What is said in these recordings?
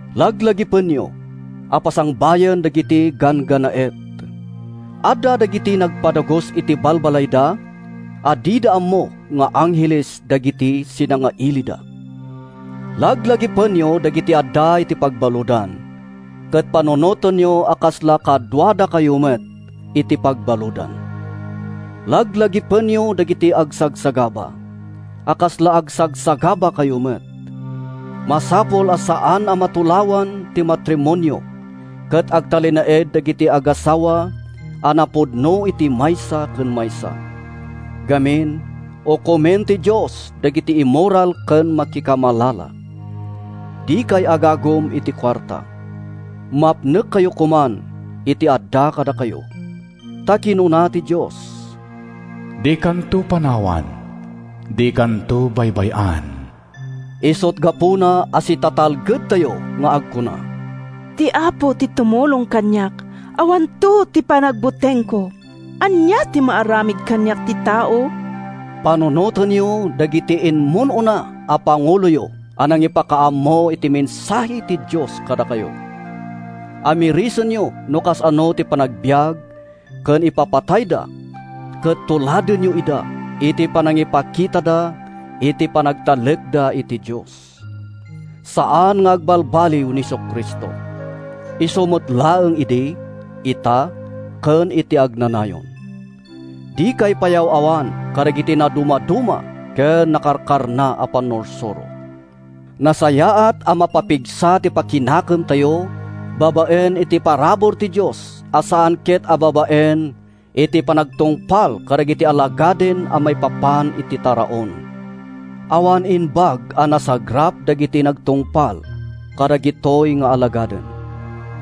Laglagipenyo a pasangbayen dagiti ganggannaet. Adda dagiti nagpadagus iti balbalayda a dida ammo nga angheles dagiti sinangailida. Laglagipenyo dagiti adda iti pagbaludan ket panunotenyo a kasla kaduadakayo met iti pagbaludan. Laglagipenyo dagiti agsagsagaba, a kasla agsagsagabakayo met. Masapul a saan a matulawan ti matrimonio ket agtalinaed dagiti agassawa a napudno iti maysa ken maysa. Ngamin, ukomento ti Dios dagiti immoral ken makikamalala. Dikay agagum iti kuarta. Mapnekkayo koman iti adda kadakayo. Ta kinuna ti Dios, “Dikanto panawan, dikanto baybay-an.” Isut’ gapuna a sitatalgedtayo nga agkuna, “Ti Apo ti tumulong kaniak, Awanto ti panagbutengko. Ania ti maaramid kaniak ti tao?” Panunotenyo dagiti immun-una a panguloyo a nangipakaammo iti mensahe ti Dios kadakayo. Ammirisenyo no kasano ti panagbiag ken ipapatayda ket tuladenyo ida iti panangipakitada iti panagtalekda iti Dios. Saan nga agbalbaliw ni Jesu-Cristo. Isu met laeng idi, ita ken iti agnanayon. Dikay payaw-awan kadagiti nadumaduma ken karkarna a pannursuro. Nasayaat a mapapigsa ti pakinakemtayo babaen iti parabur ti Dios a saan ket a babaen iti panagtungpal kadagiti alagaden maipapan iti taraon. Awan imbag a nasagrap dagiti nagtungpal kadagitoy nga alagaden.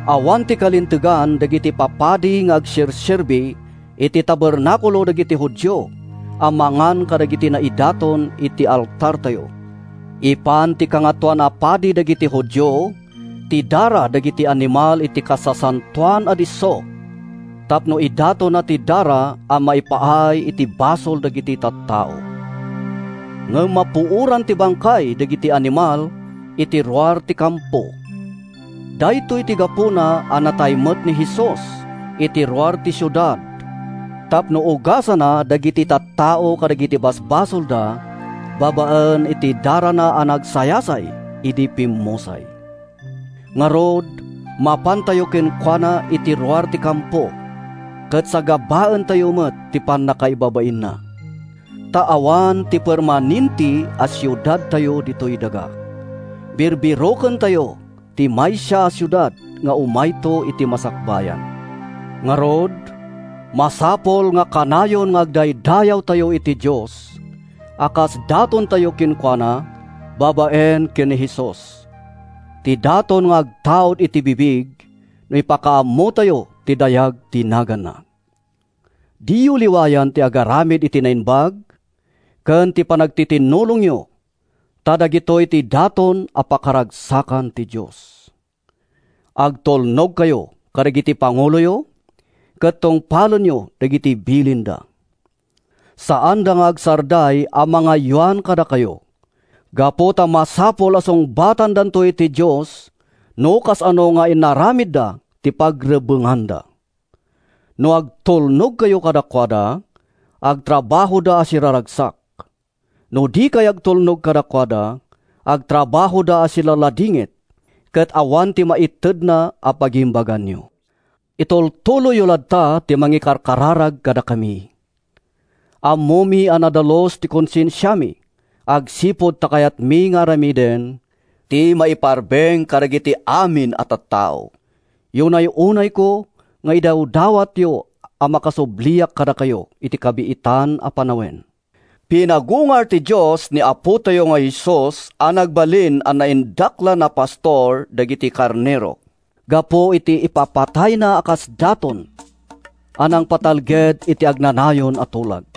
Awan ti kalintegan dagiti papadi nga agserserbi iti tabernakulo dagiti Judio a mangan kadagiti naidaton iti altartayo. Ipan ti Kangatoan a Padi dagiti Judio ti dara dagiti animal iti Kasasantoan a Disso tapno idatonna ti dara a maipaay iti basol dagiti tattao. Ngem mapuoran ti bangkay dagiti animal iti ruar ti kampo. Daytoy ti gapuna a natay met ni Jesus iti ruar ti siudad tapno ugasanna dagiti tattao kadagiti basbasolda babaen iti darana a nagsayasay idi pimmusay. Ngarud, mapantayo kenkuana iti ruar ti kampo ket sagabaentayo met ti pannakaibabainna. Ta awan ti permanente a siudadtayo ditoy daga. Birbirokentayo ti maysa a siudad nga umayto iti masakbayan. Ngarud, masapul a kanayon nga agdaydayawtayo iti Dios a kas datontayo kenkuana babaen ken ni Jesus—ti daton nga agtaud iti bibig no ipakaammotayo ti dayag ti naganna. Diyo liwayan ti agaramid iti naimbag ken ti panagtitinnulongyo, ta dagitoy ti daton a pakaragsakan ti Dios. Agtulnogkayo kadagiti panguloyo ket tungpalenyo dagiti bilinda. Saanda nga agsarday a mangaywan kadakayo, gapu ta masapul a sungbatandanto iti Dios no kasano nga inaramidda ti pagrebbenganda. No agtulnogkayo kadakuada, agtrabahoda a siraragsak. No dikay agtulnog kadakuada, agtrabahoda a silaladingit ket awan ti maitedna a pagimbaganyo. Itultuloyyo latta ti mangikarkararag kadakami. Ammomi a nadalus ti konsensiami agsipud ta kayatmi nga aramiden ti maiparbeng kadagiti amin a tattao. Yunay-unayko nga idawdawatyo a makasubliak kadakayo iti kabiitan a panawen. Pinagungar ti Dios ni Apotayo a Jesus a nagbalin a Naindaklan a Pastor dagiti karnero gapu iti ipapatayna a kas daton a nangpatalged iti agnanayon a tulag.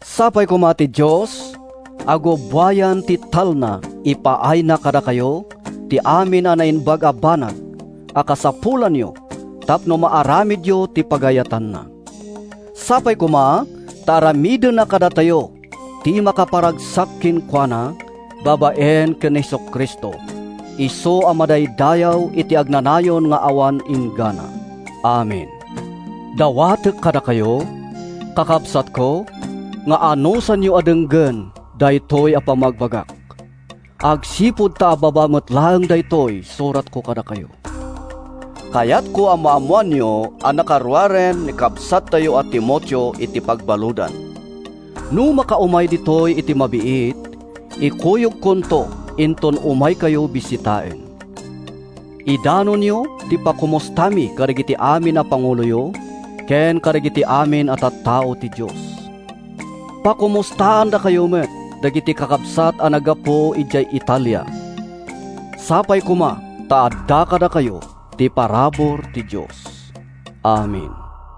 Sapay koma ta ti Dios a gubbuayan ti talna ipaayna kadakayo ti amin a naimbag a banag a kasapulanyo tapno maaramidyo ti pagayatanna. Sapay koma ta aramidenna kadatayo ti makaparagsak kenkuana babaen ken ni Jesu-Cristo, isu a madaydayaw iti agnanayon nga awan inggana! Amen. Dawatek kadakayo, kakabsatko, nga anusanyo a denggen daytoy a pammagbagak, agsipud ta ababa met laeng daytoy suratko kadakayo. Kayatko a maammoanyo a nakaruaren ni kabsattayo a Timoteo iti pagbaludan. No makaumay ditoy iti mabiit, ikuyogkonto inton umaykayo bisitaen. Idanonyo ti pakomustami kadagiti amin a panguloyo ken kadagiti amin a tattao ti Dios. Pakomustaandakayo met dagiti kakabsat a naggapu idiay Italia. Sapay koma ta adda kadakayo ti parabur ti Dios. Amen.